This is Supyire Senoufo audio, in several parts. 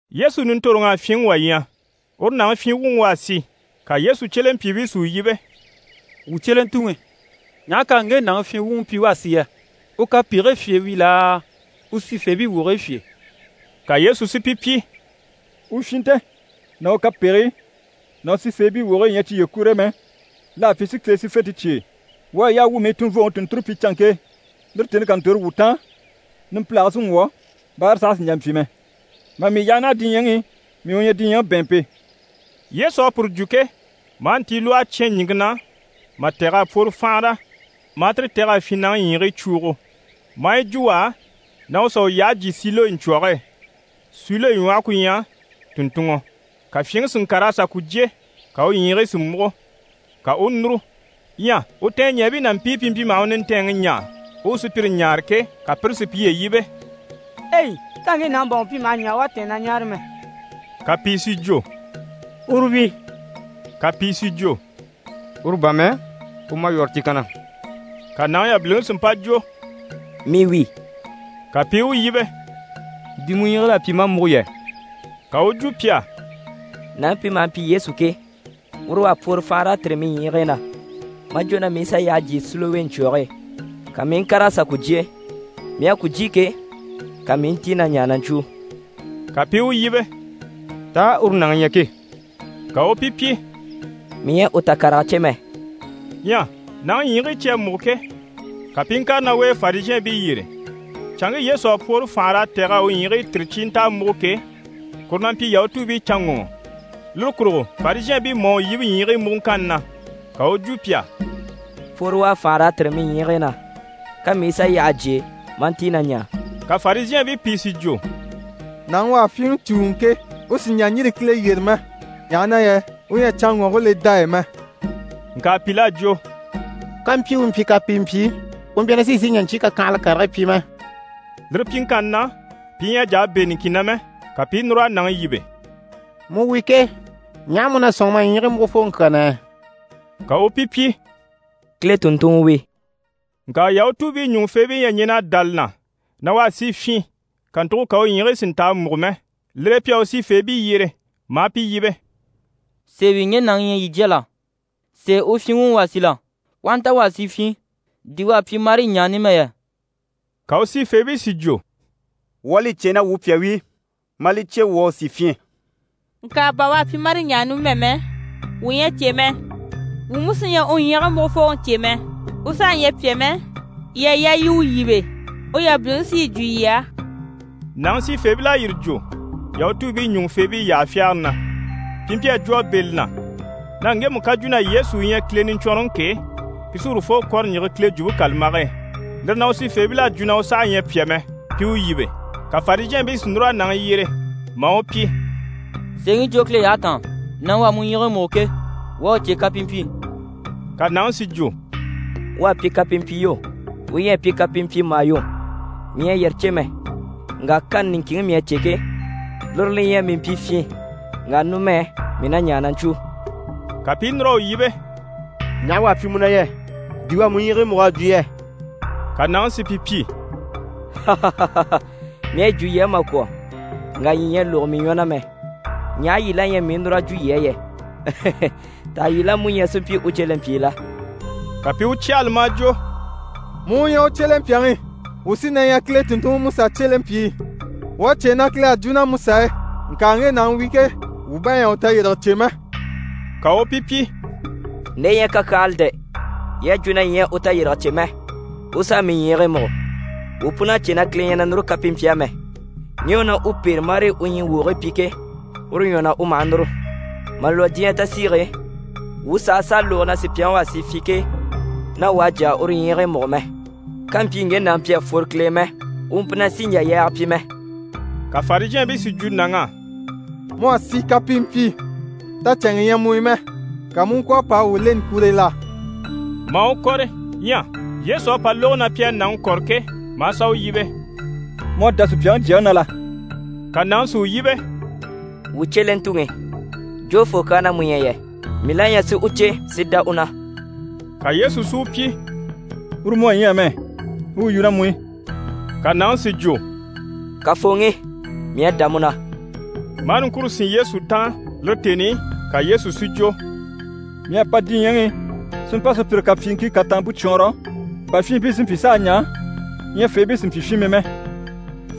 Yesu nintoroŋ'à fyinŋi wà ɲya, uru nàŋi fyin wuŋi u à si. Ka Yesu cyelempyiibii si u yíbe: «Wuu cyelentuŋi, ɲaha k'à ŋge nàŋi fyin wuŋi pyi u à si yɛ? U kapegigii fyè wi laa, u sifeebii wogigii fyè?» Ka Yesu si pi pyi: «U fyinnte ná u kapegigii ná u sifeebii wogigii ɲyɛ cyiye kur'e mɛ, l'à pyi si Kile sífente cyêe. Wuu à yaa wuu mii tunvooŋi tùnnture pyi canŋke e, lire tèni ká ntòro wuu taan, numpilage sí n‑wwɔ̀, báara saha sì n‑jà n‑pyi mɛ. Mà mii yaha naha diɲyɛŋi i, mii u ɲyɛ diɲyɛŋi bɛ̀ɛnmpe.» Yesu à puru jwo ke, maa ntilwɔhe cyán ɲìŋke na mà tɛ̀g'a pworo fànhara, maa tire tɛ̀g'a fyinnaŋi ɲyiigii cwuugo, maa yi jwo u á, na u sà u yyahe jyé Silowe ɲcwɔ̀ge e (Silowe ɲwɔhe ku ɲyɛ: «tùnntunŋɔ»). Ka fyinŋi si ŋkàr'a sà ku jyé, ka u ɲyiigii si múgo, ka u u núru. Ɲyɛ u tɛɛnɲɛɛbii ná mpii pi mpyi maha u nintɛɛnŋi ɲaa u u sùpyire ɲáare ke, ka pire si piye yíbe: «Ei! Tá ŋge nàŋi bà wuu mpyi maha ɲaa u à tɛ̀ɛn na ɲáare mɛ?» Ka pìi si jwo: «Uru wi» ka pìi si jwo: «Uru bà mɛ, u málwɔrɔ ti kanna.» Ka nàŋi yabiliŋi si mpa jwo: «Mii wi.» Ka pi i u yíbe: «Di mu ɲyiigil'à pyi maa múgo yɛ?» Ka u u jwo pi á: «Nàŋi pi maha mpyi Yesu ke, uru u à pworo fànhara a tìri mii ɲyiigii na, maa jwo na mii i sà yyahe jyé Silowe ɲcwɔ̀ge e. Ka mii i ŋkàr'a sà ku jyé. Mii à ku jyé ke, ka mii i ntíi na ɲaa na ɲcwúu.» Ka pi i u yíbe: «Taa uru nàŋi ɲyɛ ke?» Ka u u pi pyi: «Mii ɲyɛ a u takarega cè mɛ.» Ɲyɛ nàŋi ɲyiigii cyi à múgo ke, ka pi i ŋkàre ná u e Farizhɛɛnbii yyére. Canŋke Yesu à pwoore fànhara a tɛ̀g'a u ɲyiigii tìri cyi i nta a múgo ke, kuru na mpyi Yahutuubiicanŋɔŋɔ. Lire kurugo Farizhɛɛnbii mú à u yíbe ɲyiigii múguŋkanni na. Ka u u jwo pi á: «Pworo u à fànhara a tìri mii ɲyiigii na, ka mii i sà yyahe jyé maa ntíi na ɲaa.» Ka Farizhɛɛnbii pìi si jwo: «Nàŋi u à fyinŋi cùuŋɔ ke, u sì n‑jà n‑yîri Kile yyére mɛ, ɲaha na yɛ u ɲyɛ a canŋɔŋke le dá e mɛ.» Ŋka pìl'à jwo: «Kàmpyi u mpyi kapimpyi, u mpyi na sì n‑sìi n‑jà ɲcyii kakyanhala karigii pyi mɛ.» Lire pyiŋkanni na, pi ɲyɛ a jà a bɛ̂ niŋkin na mɛ. Ka pi i núr'a nàŋi yíbe: «Mu wi ke, ɲaha mu na sɔ̂nŋi ma ɲyiigii múgufooŋi kyaa na yɛ?» Ka u u pi pyi: «Kile tùnntunŋɔ wi.» Ŋka Yahutuubii ɲùŋufeebii ɲyɛ a ɲɛn'a dá li na na u à si fyin, kàntugo ka u ɲyiigii si nta a múgo mɛ. Lire e pi à u sifeebii yyere, maa pi yíbe: «Sèe wi ŋge nàŋi ɲyɛ yii jya la? Sèe u fyin wuŋi u à si la? U aha nta u à si fyin, di u à pyi marii ɲaa numɛ yɛ?» Ka u sifeebii si jwo: «Wuu à li cè na wuu pyà wi, maa li cè wuu à u si fyin. Ŋka bà u à pyi marii ɲaa numɛ mɛ, wuu ɲyɛ a cè mɛ. Wuu mú sí ɲyɛ a u ɲyiigii múgufooŋi cè mɛ. U saha ɲyɛ pyà mɛ, yii à yaa yii i u yíbe, u yabiliŋi sí yi jwo yii á.» Nàŋi sifeebil'à yire jwo Yahutuubii ɲùŋufeebii yyaha fyagare na. Pi mpyi a jwo a bɛ̂ li na na ŋgemu ká jwo na Yesu u ɲyɛ Kile Niɲcwɔnrɔŋi ke, pi sí urufoo kɔ̀rɔ n‑yige Kile Jwumpe kàlambage e. Lire na, u sifeebil'à jwo na u saha ɲyɛ pyà mɛ, pi u yíbe. Ka Farizhɛɛnbii si núr'a nàŋi yyere, maa u pyi: «Sèeŋi jwo Kile yyahe taan, nàŋi u à mu ɲyiigii múgo ke, wuu à u cè kapimpyi.» Ka nàŋi si jwo: «U à pyi kapimpyi yo, u ɲyɛ a pyi kapimpyi mà yo, mii ɲyɛ a yire cè mɛ, ŋka kani niŋkinŋi mii à cè ke, lire li ɲyɛ mii mpyi fyin, ŋka numɛ mii na ɲaa na ɲcwúu.» Ka pi i núr'a u yíbe: «Ɲaha u à pyi mu na yɛ? Di u à mu ɲyiigii múg'a jwo yɛ?» Ka nàŋi si pi pyi: «Mii à yi jwo yii á mà kwɔ̀, ŋka yii ɲyɛ a lógo mii ɲwɔ na mɛ, ɲaha yyaha yii la ɲyɛ mii u núr'a jwo yii á yɛ? Taha yii la mú ɲyɛ si mpyi u cyelempyii la?» Ka pi i u cyahala, maa jwo: «Mu u ɲyɛ u cyelempyaŋi, wuu sí na ɲyɛ Kile tùnntunŋiMusa cyelempyii. Wuu à cè na Kile à jwo ná Musa e, ŋka ŋge nàŋi wi ke, wuu bá ɲyɛ a u tayirige cè mɛ.» Ka u u pi pyi: «Nde ɲyɛ kakyanhala dɛ! Yii à jwo na yii ɲyɛ a u tayirige cè mɛ, u s'à mii ɲyiigii múgo. Wuu pun'à cè na Kile ɲyɛ na núru kapimpyi á mɛ. Ŋge u na u pêre marii u ɲyii wogigii pyi ke, uru ɲwɔ na u maha núru. Mà lwɔ́ diɲyɛ tasiige e, wuu sàha sàa lógo na sùpyaŋi u à si fyin ke, na wà à jà a uru ɲyiigii múgo mɛ. Kàmpyi ŋge nàŋi mpyi a fworo Kile e mɛ, u mpyi na sì n‑jà yaaga pyi mɛ.» Ka Farizhɛɛnbii si jwo nàŋ'á: «Mu à si kapimpyi, tacɛnŋɛ ɲyɛ mu i mɛ! Ka mu u ŋkwɔ̀ a pa a wuu leni kure e la?» Maa u kɔ̀rɔ. Ɲyɛ Yesu à pa lógo na pi à nàŋi kɔ̀rɔ ke, maa sà u yíbe: «Mu à dá Supyaŋi Jyaŋi na la?» Ka nàŋi si u yíbe: «Wuu cyelentuŋi, jofoo kyaa na mu ɲyɛ yɛ? Mii la ɲyɛ si u cè si dá u na.» Ka Yesu si u pyi: «Uru mu à ɲya amɛ, u u yu ná mu i.» Ka nàŋi si jwo: «Kafooŋi, mii à dá mu na» maa niŋkure sín Yesu taan. Lire tèni i, ka Yesu si jwo: «Mii à pa diɲyɛŋi i si mpa sùpyire kapyiiŋkii kataampe cwɔɔnrɔ, bà fyinmpii si mpyi s'a ɲaa, ɲyafeebii si mpyi fyinmii mɛ.»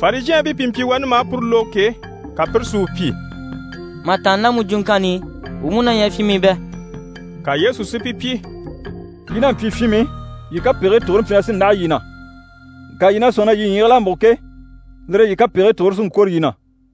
Farizhɛɛnbii pi mpyi wani maa puru lógo ke, ka pire si u pyi: «Mà tàanna ná mu jwuŋkanni i, wuu mú na ɲyɛ fyinmii bɛ?» Ka Yesu si pi pyi: «Yii n'a mpyi fyinmii, yii kapegigii tugure mpyi na sí n‑láha yii na, ŋka yii na sɔ̂nŋi na yii ɲyiigil'à múgo ke, lire e yii kapegigii tugure sí n‑kwôro yii na.»